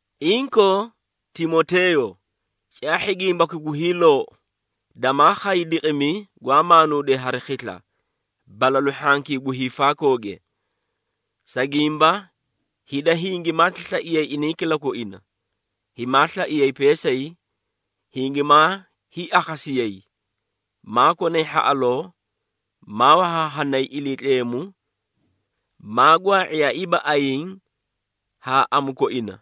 Inkoo Timoteeyo, caahhi gimbaki gu hiiloou, damaa khay diqimi gwaa maanuudee hari khisla, balalu hhankii gu hiifaakooge. Sa gimba hida hingimaati slaiyay inay kilakoina, himaa slaiyay peesay, hingimaa hiiakhasiyayi, maa konay hhaꞌaloo, maa wahaahanay Iliitleemu, maa gwaa⁄iyaaiiba ayiĩ haa amu koina,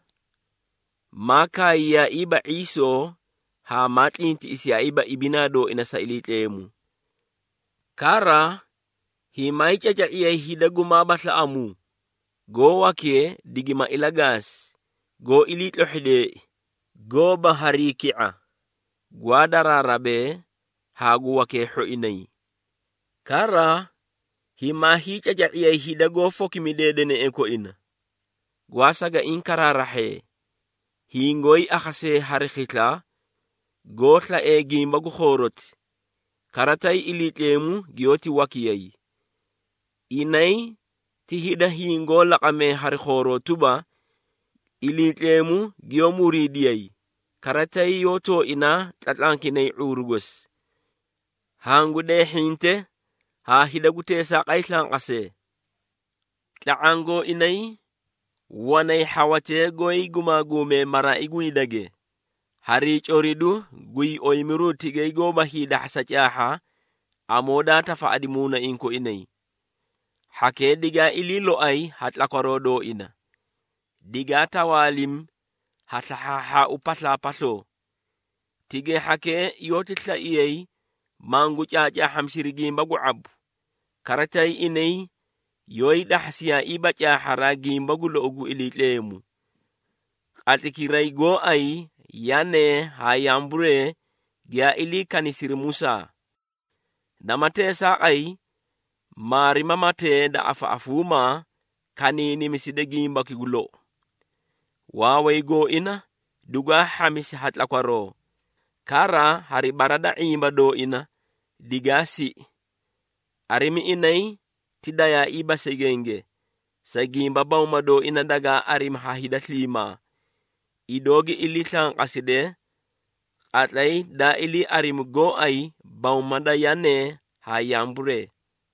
maa kaayayiiba ⁄iisoo haa maa tlintiꞌisiyaaiiba ibinaa dooina sa Iliitleemu. Kara himaayii caca⁄iyay hida gumaaba slaꞌamuu, goó wakee digima ilagaasi, goó iliitlohhideei, goóba harii ki⁄a, gwaa daraarabee haa gu wakee hhoinay. Kara himaa hiicaca⁄iyay hida goó fokimidee deneꞌee koina, gwaa sagaiĩ karaarahhee, hingoóyii akhasee hari khisla, goó slaee gimba gu khooroti, kara tay Iliitleemu giyoóti wakiyay. Inay ti hida hingoó laqamee hari khooroo tuba, Iliitleemu giyoó muriidiyay, kara tay yoó tooinaa tlatlankinay ⁄uuru gosi. Hangu deehhinte haa hida gu teesaaqay slanqasee. Tla⁄aã gooinay wanay hhawatee goóyii gumaaguumee maraai gu hidage harii coridu guyii oyimiru tigay goóba hiidahhasa caahha amoo daa tafaꞌadi muunaiĩ koinay. Hhakee digaa ilii loay ha tlakwaroo dooina, digaa tawaalimi ha slahhaahhaau paslaapasloo. Tigay hhakee yoóti slaiyay mangu caacaahhamisiri gimba gu ⁄abu, kara tay inay yoóyii dahhasiyaaiiba caahharaa gimba gu lou gu Iliitleemu. Qatlaykiraa gooay Yanee haa Yamburee giyaa ilii kanisiri Musaa. Nama teesaaqay maarimamatee da afaꞌafuumaa kaniinimisida gimbaki gu lou. Waaway gooina dugwaa hhamisi ha tlakwaroo, kara hari bara da ⁄imba dooina digaa siꞌi. Arimi inay ti dayaaiiba segenge, sa gimba bawma dooina dagaa arimi ha hida sliimaa, idoo gi slanqaside, qatlay daa ilii arimi gooay bawma da Yanee haa Yamburee.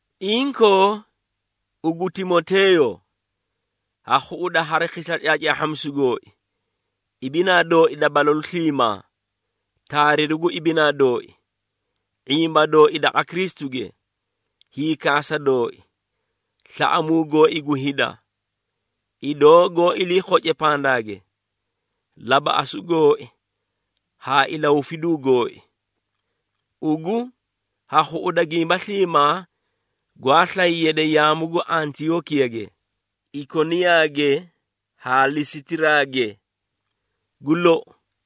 Inkoo ugu Timoteeyo, ha khuꞌuda hari khisla caacaahhamisu gooi, ibinaa dooi da balalu sliimaa, taariru gu ibinaa dooi, ⁄imba dooi daqa Kristuge, hiikaasa dooi, slaꞌamuu gooi gu hida, idoo goó ilii khoce pandaage, labaꞌasu gooi haa ilahufiduu gooi. Ugu ha khuꞌuda gimba sliimaa gwaa slay yade yaamu gu Antiyookiyage, Ikoniyaage haa Lisitiraage. Gu lou,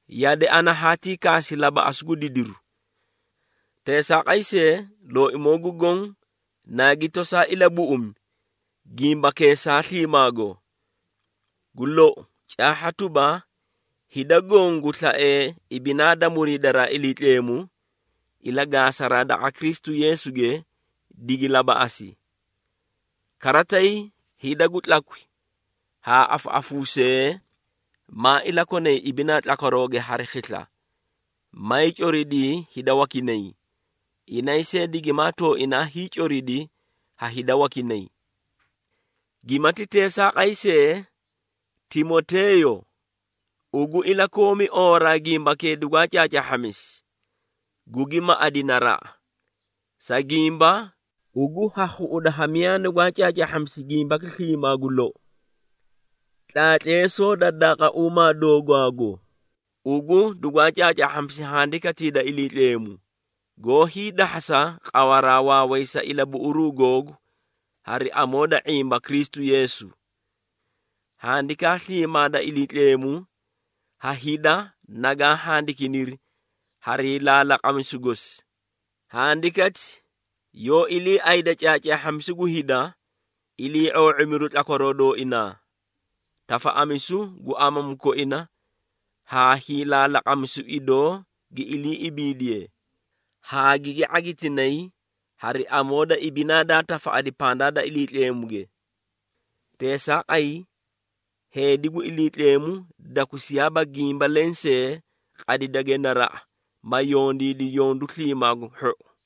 yade ana haatii kaasi labaꞌasu gu didiru. Teesaaqay see, Looimoo gu Goõ naagi tosaa ilabuꞌumi gimbakeesaa sliimaago. Gu lou, caahha tuba, hida goõ gu slaee ibinaa da muriidaraa da Iliitleemu, ilagaasaraa daqa Kristu Yeesuge, digi labaꞌasi. Kara tay hida gu tlakwi haa afaꞌafuusee, maa ilakonay ibinaa tlakwarooge hari khisla, mayii coridii hida wakinay, inay see digimaa tooinaa hiicoridi ha hida wakinay. Gimati teesaaqay see, Timoteeyo, ugu ilakoomi oowaraa gimbakee dugwaa caacaahhamisi, gugi maꞌadi naraꞌa, sa gimba ugu ha khuꞌuda ha miyaa nugwaa caacaahhamisi gimbaki sliimaa gu lou. Tlaatleesoo da daaqauumaa doogwaago, ugu dugwaa caacaahhaahhamisi Handikatii da Iliitleemu, goó hiidahhasa qawaraa waaway sa ilabuꞌuruu googu hari amoo da ⁄imba Kristu Yeesu. Handikaa sliimaa da Iliitleemu ha hida nagaa handikiniri harii laalaqamisuu gosi. Handikati yoó iliiayda caacaahhamisu gu hida, ilii⁄oo⁄imiru tlakwaroo dooinaa, tafaꞌamisu gu amamu koina haa hiilaalaqamisu idoo gi ilii ibiidiye, haa gigi ⁄agitinay hari amoo da ibinaa daa tafaꞌadi pandaa da Iliitleemu. Teesaaqay heedi gu Iliitleemu, dakusiyaaba gimba lensee, qadidage naraꞌa ma yondiidi yondu sliimaa gu hhou.